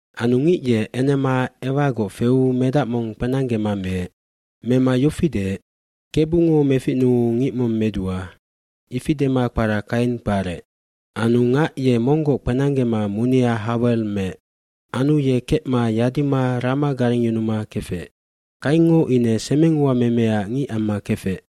Anu ngic ye enema Ewagoc feu medac mong kpenanggema meec. Mema yofi deec, “Kebungo meficnuu ngic mong medua,” ifi dema kpara Kaina kparec. Anu ngac ye monggoc kpenanggema munia Hawel meec. Anu ye kecma yadima rama garengyunuma kefec. Kaingngo ine semenguamemeac ngic amma kefec.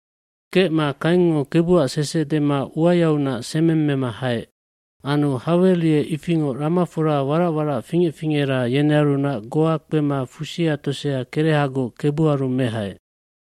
Kecma Kaingngo Kebuac sese dema uayaunac semeng mema haec. bAnu Hawel ye ifingoc ramafora warac warac fingec fingera yenearunac goa kpema kerecngina tosea Kebuaru mehaec.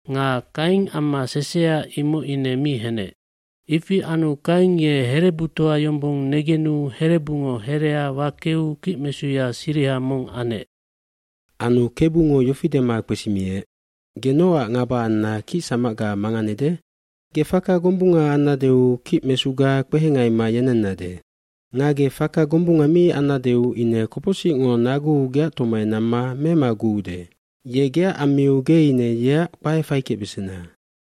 nga Kain amma sesea imoc ine mi henec. Ifi anu Kain ye herebutoa yombong negenu herebungo herea wakeu kicmesuya siriha mong anec. Anu Kebungo yofi dema kpesimiec, “Ge nocac ngaba anna kicsamacga manganede? cGe faka gombunga annadeu kicmesuga kpehengaima yenennade. Nga ge faka gombunga mi annadeu ine kopocsicngo naguu geac tomai namma memaguude. Ye geac ammiu ge ine yeac kpae faikecbesena.”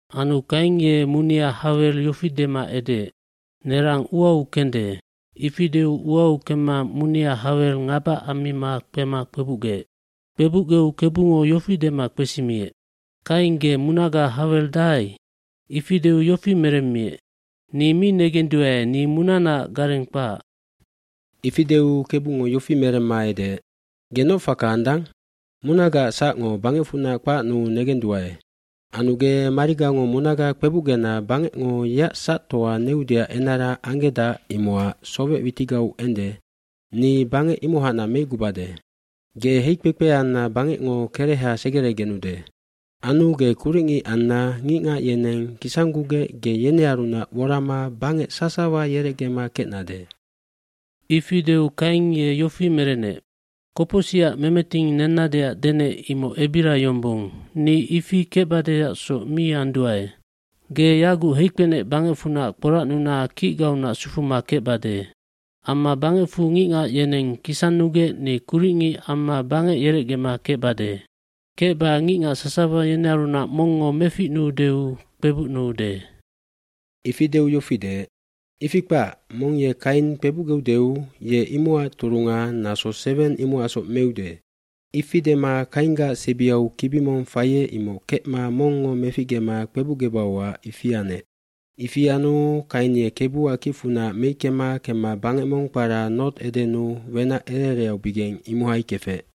dAnu Kain ye munia Hawel yofi dema edeec, “Nerang uau kende.” Ifi deu uau kemma munia Hawel ngaba ammima kpema kpebucgeec. Kpebucgeu Kebungo yofi dema kpesimiec, “Kain ge munaga Hawel dahai?” Ifi deu yofi meremmiec, “Ni mi negenduae ni munanaac gareng kpahac.” eIfi deu Kebungo yofi meremma edeec, “Ge noc faka andang? Munagaac sacngo bangecfunac kpacnuu negenduae. Anu ge marigango munaga kpebucgena bangecngo yeac sactoa neudeac enara anggedac imocac sowec witigau ende, ni bangec imohacnac meicgubade. Ge heikpekpe anna bangecngo kereha segeregenude. Anu ge kuricngic anna ngicngac yeneng kisanggugec ge yenearunac worama bangec sasawa yerecgema kecnade.” Ifi deu Kain ye yofi merenec, “Kopocsicac memeting nennadeac denec imoc ebira yombong, ni ifi kecbadeacsoc mi anduae. fGe yaguc heikpenec bangecfunac kporacnuna kicgaunac sufuma kecbade. Amma bangecfu ngicngac yeneng kisannugec ni kuricngic amma bangec yerecgema kecbade. Kecba ngicngac sasawa yenearunac mongngo meficnuudeu kpebucnuude.” Ifi deu yofi deec, “Ifi kpac, mong ye Kain kpebucgeudeu ye imocac turunga naso seweng imocacsoc meude.” Ifi dema Kainggac sebiau kibi mong faiec imoc kecma mongngo meficgema kpebucgebauac ifi anec. Ifi anu Kain ye Kebuac kicfunac meickema kemma bangec mong kpara Nod, Edennu wenac ere ereaubigeng imohai kefec.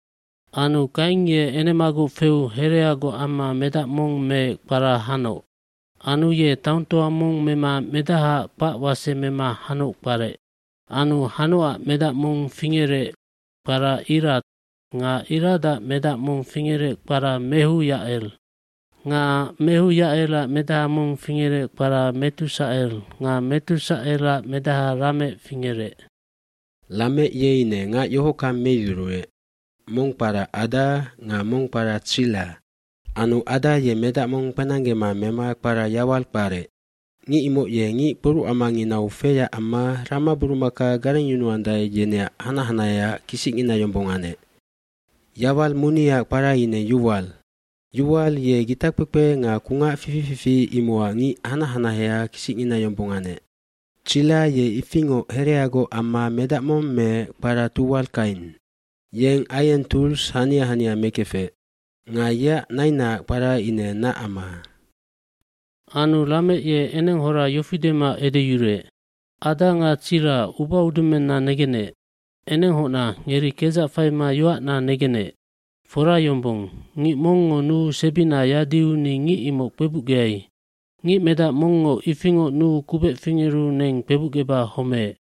Anu Kain ye enemagoc feu hereagoc amma medac mong meec kpara Hanoc. Anu ye taongtoa mong mema medahaac kpac wase mema Hanoc kparec. Anu Hanocac medac mong fingerec kpara Irad nga Iradac medac mong fingerec kpara Mehuyacel. Nga Mehuyacelac medaha mong fingerec kpara Metusacel nga Metusacelac medaha Lamec fingerec. Lamec ye ine ngac yohockang meyuruec, mong kpara Ada nga mong kpara Tsilla. Anu Ada ye medac mong kpenanggema mema kpara Yawal kparec. Ngic imoc ye ngic kporucamanginau feyac amma ramaburumaka garengyunuandae yeneac hanac hanaheaac kisicngina yombong anec. Yawal muniaac kpara ine Yuwal. Yuwal ye gitakpekpe nga kungac fifi fifi imocac ngic hanac hanaheaac kisicngina yombong anec. Tsilla ye ifingoc hereagoc amma medac mong meec kpara Tuwal Kain. Yeng aieng tools hania hania mekefec. Nga yeac nainaac kpara ine Nacama. Anu Lamec ye enenghora yofi dema edeyuruec, “Ada nga Tsilla ubaudumenna negenec, enenghocna ngeri kedzac faima yoacna negenec, fora yombong, ngic mongngo nuu sebina yadiu ni ngic imoc kpebucgeai. Ngic medac mongngo ifingoc nuu kubec fingeru neng kpebucgeba homeec.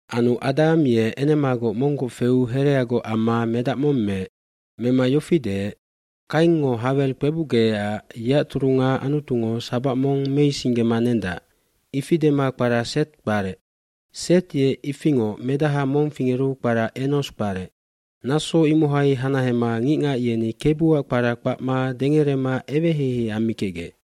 Anu Adam ye enemagoc monggoc feu hereagoc amma medac mong meec. Mema yofi deec, “Kaingngo Hawel kpebucgecac yeac turunga Anutungo sabac mong meisinggema nendac.” Ifi dema kpara Seth kparec. iSet ye ifingoc medaha mong fingeru kpara Enos kparec. Naso imohai hanahema ngicngac yeni Kebuac kpara kpacma dengerema eweheihei ammikecgec.